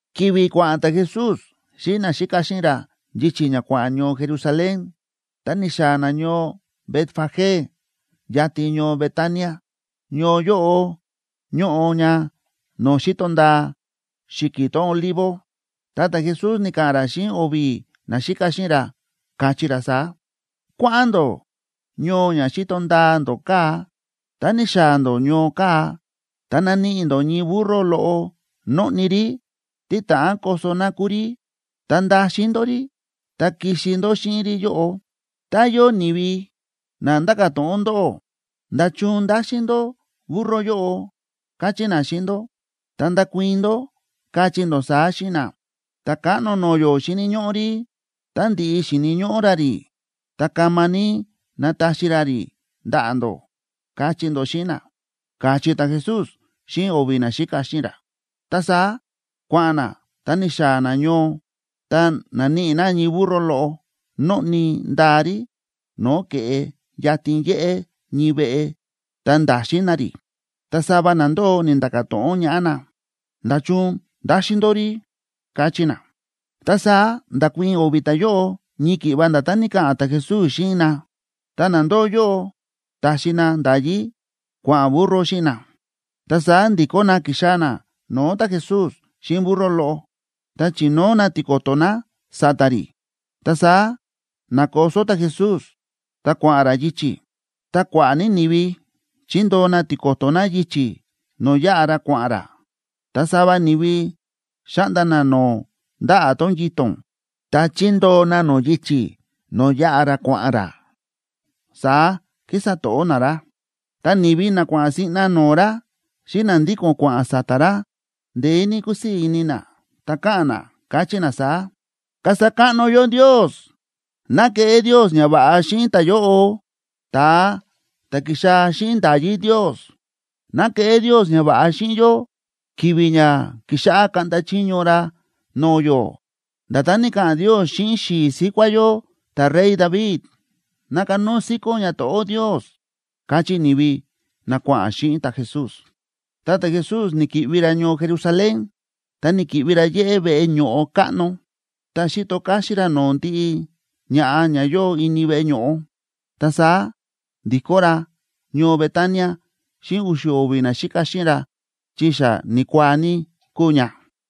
Ki̱vi̱ kua̱ꞌa̱n ta̱Jesús xíꞌin naxíka xíꞌin ra yichi̱ ña kua̱ꞌa̱n ñoo Jerusalén, ta ni̱xaa̱ na ñoo Betfagé yatin ñoo Betania. Ñoo yóꞌo ñóꞌo ña no̱o̱ xíto ndaa xi̱ki̱ tón Olivo. Ta ta̱Jesús ni̱ka̱ꞌa̱n ra xíꞌin o̱vi̱ naxíka xíꞌin ra, káchí ra saá: ―Kua̱ꞌa̱n ndó ñoo ña xíto ndaa ndó kaa̱. Tá ni̱xaa̱ ndó ñoo kaa̱, ta naníꞌi ndó ñii burro loꞌo nóꞌni rí, tí ta̱ꞌán koso na kúu rí. Ta ndaxin ndó rí ta kixi ndó xíꞌin rí yóꞌo. Tá yóo ni̱vi na nda̱ka̱ to̱ꞌon ndóꞌó: “¿Nda̱chun ndáxin ndó burro yóꞌo?”, kachí na xíꞌin ndó, ta ndakuii̱n ndó, kachí ndó saá xíꞌin na: “Ta̱káꞌno no̱o̱ yó xíni̱ ñóꞌó rí, tá ndi̱ꞌi xíni̱ ñóꞌó ra rí, ta kama ní nataxi ra rí ndaꞌa̱ ndó”, kachí ndó xíꞌin na ―káchí ta̱Jesús xíꞌin o̱vi̱ naxíka xíꞌin ra. Ta saá kua̱ꞌa̱n na, ta ni̱xaa̱ na ñoo, ta na̱níꞌi na ñii burro loꞌo nóꞌni ndaa rí no̱o̱ ke̱ꞌe yatin yéꞌé ñii veꞌe, ta nda̱xin na rí. Ta sava na ndóo ni̱nda̱ka̱ to̱ꞌon ñaꞌá na: ―¿Nda̱chun ndáxin ndó rí? ―káchí na. Ta saá nda̱kuii̱n o̱vi̱ ta̱yóꞌo ñii ki̱ꞌva nda̱tán ni̱ka̱ꞌa̱n ta̱Jesús xíꞌin na, ta na ndóo yóꞌo ta̱xi na nda̱yí kua̱ꞌa̱n burro xíꞌin na. Ta saá ndi̱kó na ki̱xaa̱ na no̱o̱ ta̱Jesús xíꞌin burro loꞌo, ta chi̱nóo na tiko̱to̱ na sa̱ta̱ rí, ta saá na̱koso ta̱Jesús ta kua̱ꞌa̱n ra yichi̱. Ta kua̱ꞌa̱ ní ni̱vi chi̱ndoo na tiko̱to̱ na yichi̱ no̱o̱ yáꞌa ra kua̱ꞌa̱n ra, ta sava ni̱vi xa̱ꞌnda na no̱o̱ ndaꞌa̱ tón yito̱n, ta chi̱ndoo na nó yichi̱ no̱o̱ yáꞌa ra kua̱ꞌa̱n ra, saá kísa to̱ꞌó na ra. Ta ni̱vi na kua̱ꞌa̱n siꞌna no̱o̱ ra xíꞌin na ndíko̱n kua̱ꞌa̱n sa̱ta̱ ra, ndeé ní kúsii̱ ini na, ta káꞌa̱n na, káchí na saá: ―¡Kasa káꞌno yó Ndios! ¡Ná keꞌé Ndios ñava̱ꞌa xíꞌin ta̱yóꞌo, ta̱a ta̱ ki̱xaa̱ xíꞌin nda̱yí Ndios! ¡Ná keꞌé Ndios ñava̱ꞌa xíꞌin yó ki̱vi̱ ña kixáꞌá kaꞌnda chiño ra no̱o̱ yó, nda̱tán ni̱ka̱ꞌa̱n Ndios xíꞌin xi̱i̱ síkuá yó ta̱rey David! ¡Ná kanóo síkón ñato̱ꞌó Ndios! ―káchí ni̱vi na kua̱ꞌa̱n xíꞌin ta̱Jesús. Ta ta̱Jesús ni̱ki̱ꞌvi ra ñoo Jerusalén ta ni̱ki̱ꞌvi ra yéꞌé veꞌe ño̱ꞌo káꞌno. Ta xi̱to káxín ra no̱o̱ ndiꞌi ña̱ꞌa ña yóo ini veꞌe ño̱ꞌo. Ta saá ndi̱kó ra ñoo Betania xíꞌin u̱xu̱ o̱vi̱ naxíka xíꞌin ra, chi xa ni̱kuaa ní kúu ña.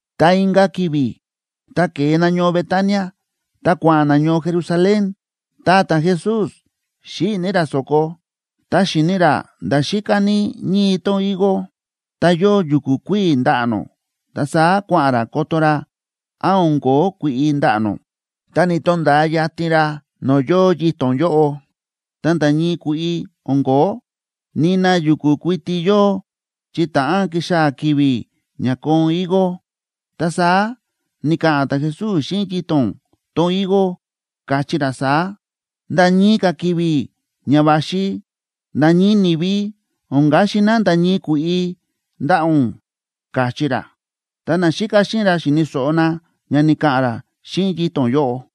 Ta inka̱ ki̱vi̱ ta ke̱e na ñoo Betania ta kua̱ꞌa̱n na ñoo Jerusalén, ta ta̱Jesús xíꞌi̱ ní ra so̱ko. Ta xi̱ni ra nda̱ xíká ní ñii tón higo ta yóo yu̱ku̱ kuíi̱ ndaꞌa̱ nó, ta saá kua̱ꞌa̱n ra koto ra án o̱n ko̱ó kui̱ꞌi ndaꞌa̱ nó. Tá ni̱to̱nda̱a yatin ra no̱o̱ yóo yito̱n yóꞌo, ta nda̱ ñii kui̱ꞌi o̱n ko̱ó, nina yu̱ku̱ kuiti yóo chi ta̱ꞌán kixaa̱ ki̱vi̱ ña koon higo. Ta saá ni̱ka̱ꞌa̱n ta̱Jesús xíꞌin yito̱n tón higo, káchí ra saá: ―Nda̱ ñii ka̱ ki̱vi̱ ña va̱xi, nda̱ ñii ni̱vi o̱n kaxi na nda̱ ñii kui̱ꞌi ndaꞌa̱ ún ―káchí ra. Ta naxíka xíꞌin ra xi̱ni̱ so̱ꞌo na ña ni̱ka̱ꞌa̱n ra xíꞌin yito̱n yóꞌo.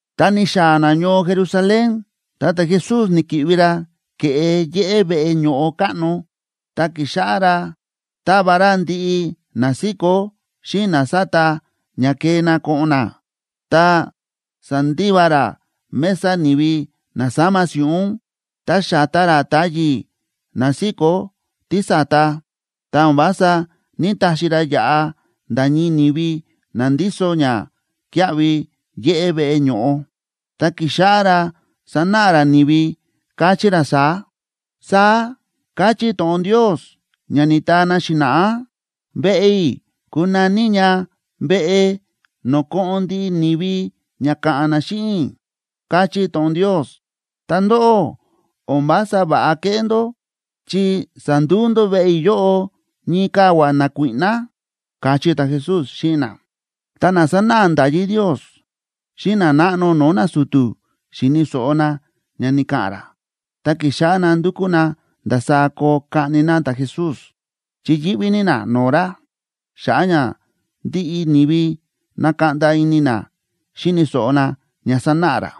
Ta ni̱xaa̱ na ñoo Jerusalén, ta ta̱Jesús ni̱ki̱ꞌvi ra ke̱ꞌe yéꞌé veꞌe ño̱ꞌo káꞌno, ta ki̱xáꞌá ra táva ra ndiꞌi na síkó xíꞌin na sáta ña kee na ko̱ꞌo̱n na. Ta sa̱ndiva ra mesa ni̱vi na sáma si̱ꞌún, ta xa̱ta ra táyi̱ na síkó tísa̱ta, ta o̱n vása ní‑taxi ra yaꞌa nda̱ ñii ni̱vi na ndíso ñakíaꞌvi yéꞌé veꞌe ño̱ꞌo. Ta ki̱xáꞌá ra sa̱náꞌa ra ni̱vi, káchí ra saá: ―Saá káchí to̱ꞌon Ndios ña ni̱taa na xi̱na̱ꞌá: “Veꞌe i̱ kunaní ña veꞌe no̱o̱ ko̱ꞌo̱n ndiꞌi ni̱vi ña ka̱ꞌa̱n na xíꞌin i̱”, káchí to̱ꞌon Ndios. Ta ndóꞌó, o̱n vása va̱ꞌa kéꞌé ndó, chi sa̱nduu ndó veꞌe yóꞌo ñii kavua̱ nakuíꞌná ―káchí ta̱Jesús xíꞌin na. Ta na sánáꞌa nda̱yí Ndios xíꞌin nanáꞌno no̱o̱ nasu̱tu̱ xi̱ni̱ so̱ꞌo na ña ni̱ka̱ꞌa̱n ra, ta ki̱xáꞌá na ndúkú na ndasaá koo kaꞌni na ta̱Jesús, chi yíꞌví ní na no̱o̱ ra, xa̱ꞌa̱ ña ndiꞌi ni̱vi na̱kaꞌnda ini na xíni̱ so̱ꞌo na ña sánáꞌa ra.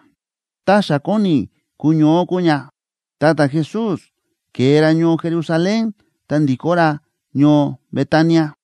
Ta xa kóni kuñoó kúu ña, ta ta̱Jesús ke̱e ra ñoo Jerusalén ta ndi̱kó ra ñoo Betania.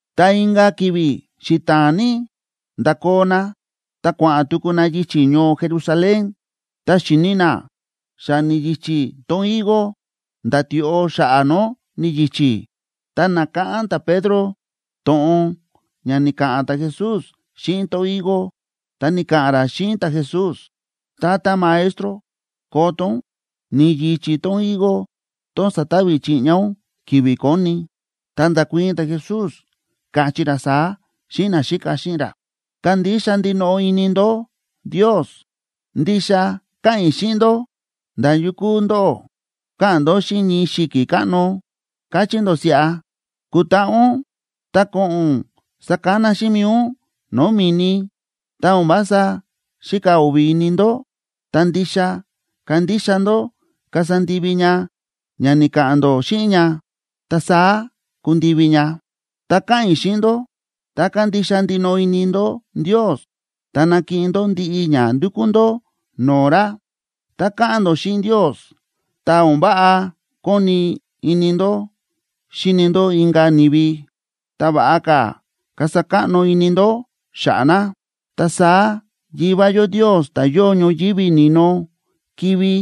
Ta inka̱ ki̱vi̱ xita̱a̱n ní, nda̱koo na ta kua̱ꞌa̱n tuku na yichi̱ ñoo Jerusalén, ta xi̱ni na xa ni̱yichí tón higo, nda̱ tioꞌo xa̱ꞌa̱ nó ni̱yichí. Ta na̱káꞌán ta̱Pedro to̱ꞌon ña ni̱ka̱ꞌa̱n ta̱Jesús xíꞌin tón higo, ta ni̱ka̱ꞌa̱n ra xíꞌin ta̱Jesús: ―Tata Maestro, koto ún, ni̱yichí tón higo tón sa̱tavi chiꞌña ún ki̱vi̱ koni. Ta nda̱kuii̱n ta̱Jesús, káchí ra saá xíꞌin naxíka xíꞌin ra: ―Kandixa ndinoꞌo ini ndó Ndios. Ndixa káꞌa̱n i̱ xíꞌin ndó, nda̱ yukú ndóꞌó ka̱ꞌa̱n ndó xíꞌin ñii xi̱ki̱ káꞌno, kachí ndó siꞌa: “Kutaꞌa ún ta ko̱ꞌo̱n ún sakana xíꞌin mi̱i ún no̱o̱ mi̱ni”, tá o̱n vása xíka o̱vi̱ ini ndó, ta ndixa kandixa ndó kasa ndivi ña ña ni̱ka̱ꞌa̱n ndó xíꞌin ña, ta saá kundivi ña. Ta káꞌa̱n i̱ xíꞌin ndó, tá kandixa ndinoꞌo ini ndó Ndios, ta nakiꞌin ndó ndiꞌi ña ndukú ndó no̱o̱ ra. Tá káꞌa̱n ndó xíꞌin Ndios, tá o̱n váꞌa kóni ini ndó xíni ndó inka̱ ni̱vi, ta va̱ꞌa ka̱ kasa káꞌno ini ndó xa̱ꞌa̱ na, ta saá Yivá yó Ndios, ta̱ yóo ñoyívi ni̱no, kivi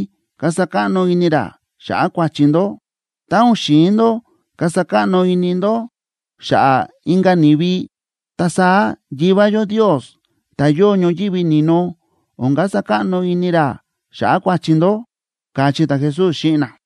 kasa káꞌno ini ra xa̱ꞌa̱ kua̱chi ndó. Tá o̱n xi̱in ndó kasa káꞌno ini ndó xa̱ꞌa̱ inka̱ ni̱vi, ta saá Yivá yó Ndios, ta̱ yóo ñoyívi ni̱no, o̱n kasa káꞌno ini ra xa̱ꞌa̱ kua̱chi ndó ―káchí ta̱Jesús xíꞌin na.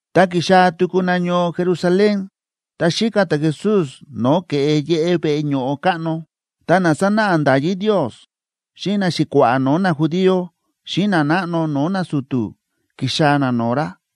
Ta ki̱xaa̱ tuku na ñoo Jerusalén. Ta xíka ta̱Jesús no̱o̱ ke̱ꞌe yéꞌé veꞌe ño̱ꞌo káꞌno, ta na sánáꞌa nda̱yí Ndios xíꞌin naxi̱kua̱ꞌa̱ no̱o̱ najudío xíꞌin nanáꞌno no̱o̱ nasu̱tu̱ ki̱xaa̱ na no̱o̱ ra,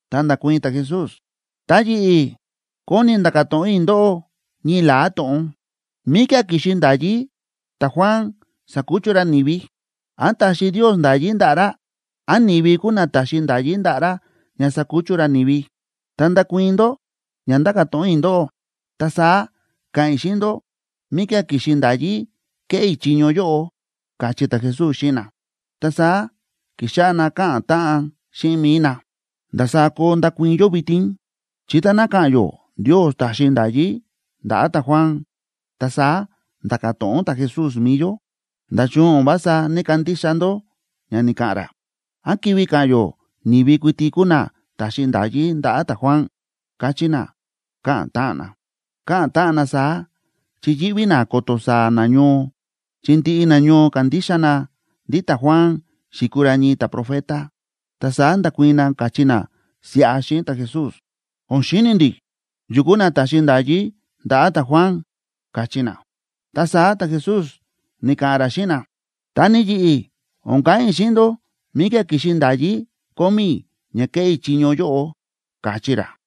Ta nda̱kuii̱n ta̱Jesús: ―Ta yi̱ꞌi̱ kóni i̱ nda̱ka̱ to̱ꞌon i̱ ndóꞌó ñii la̱á to̱ꞌon. ¿Míkía̱ ki̱xi nda̱yí ta̱Juan sa̱kuchu ra ni̱vi? ¿Án ta̱xi Ndios nda̱yí ndaꞌa̱ ra? ¿Án ni̱vi kúu na ta̱xi nda̱yí ndaꞌa̱ ra ña sakuchu ra ni̱vi? Tá ndakuii̱n ndó ña ndáka̱ to̱ꞌon i̱ ndóꞌó, ta saá ka̱ꞌa̱n i̱ xíꞌin ndó míkía̱ ki̱xi nda̱yí kéꞌé i̱ chiño yóꞌo ―káchí ta̱Jesús xíꞌin na. Ta saá ki̱xáꞌá na káꞌa̱n táꞌan xíꞌin mi̱i na: ―¿Ndasaá koo ndakuii̱n yó vitin? Chi táná ka̱ꞌa̱n yó Ndios ta̱xi nda̱yí ndaꞌa̱ ta̱Juan, ta saá nda̱ka̱ to̱ꞌon ta̱Jesús mi̱i yó: “¿Nda̱chun o̱n vása ní‑kandixa ndó ña ni̱ka̱ꞌa̱n ra?” ¿Án kivi ka̱ꞌa̱n yó ni̱vi kuiti kúu na ta̱xi nda̱yí ndaꞌa̱ ta̱Juan? ―káchí na, káꞌa̱n táꞌan na. Káꞌa̱n táꞌan na saá chi yíꞌví na ko̱to̱ saa̱ nañoo, chi ndiꞌi nañoo kándixa na ndí ta̱Juan xi̱kuu ra ñii ta̱profeta. Ta saá nda̱kuii̱n na, káchí na siꞌa xíꞌin ta̱Jesús: ―O̱n xíni̱ ndi̱ yu kúu na ta̱xi nda̱yí ndaꞌa̱ ta̱Juan ―káchí na. Ta saá ta̱Jesús ni̱ka̱ꞌa̱n ra xíꞌin na: ―Ta ni yi̱ꞌi̱, o̱n ka̱ꞌa̱n i̱ xíꞌin ndó míkía̱ ki̱xi nda̱yí kómí i̱ ña kéꞌé i̱ chiño yóꞌo ―káchí ra.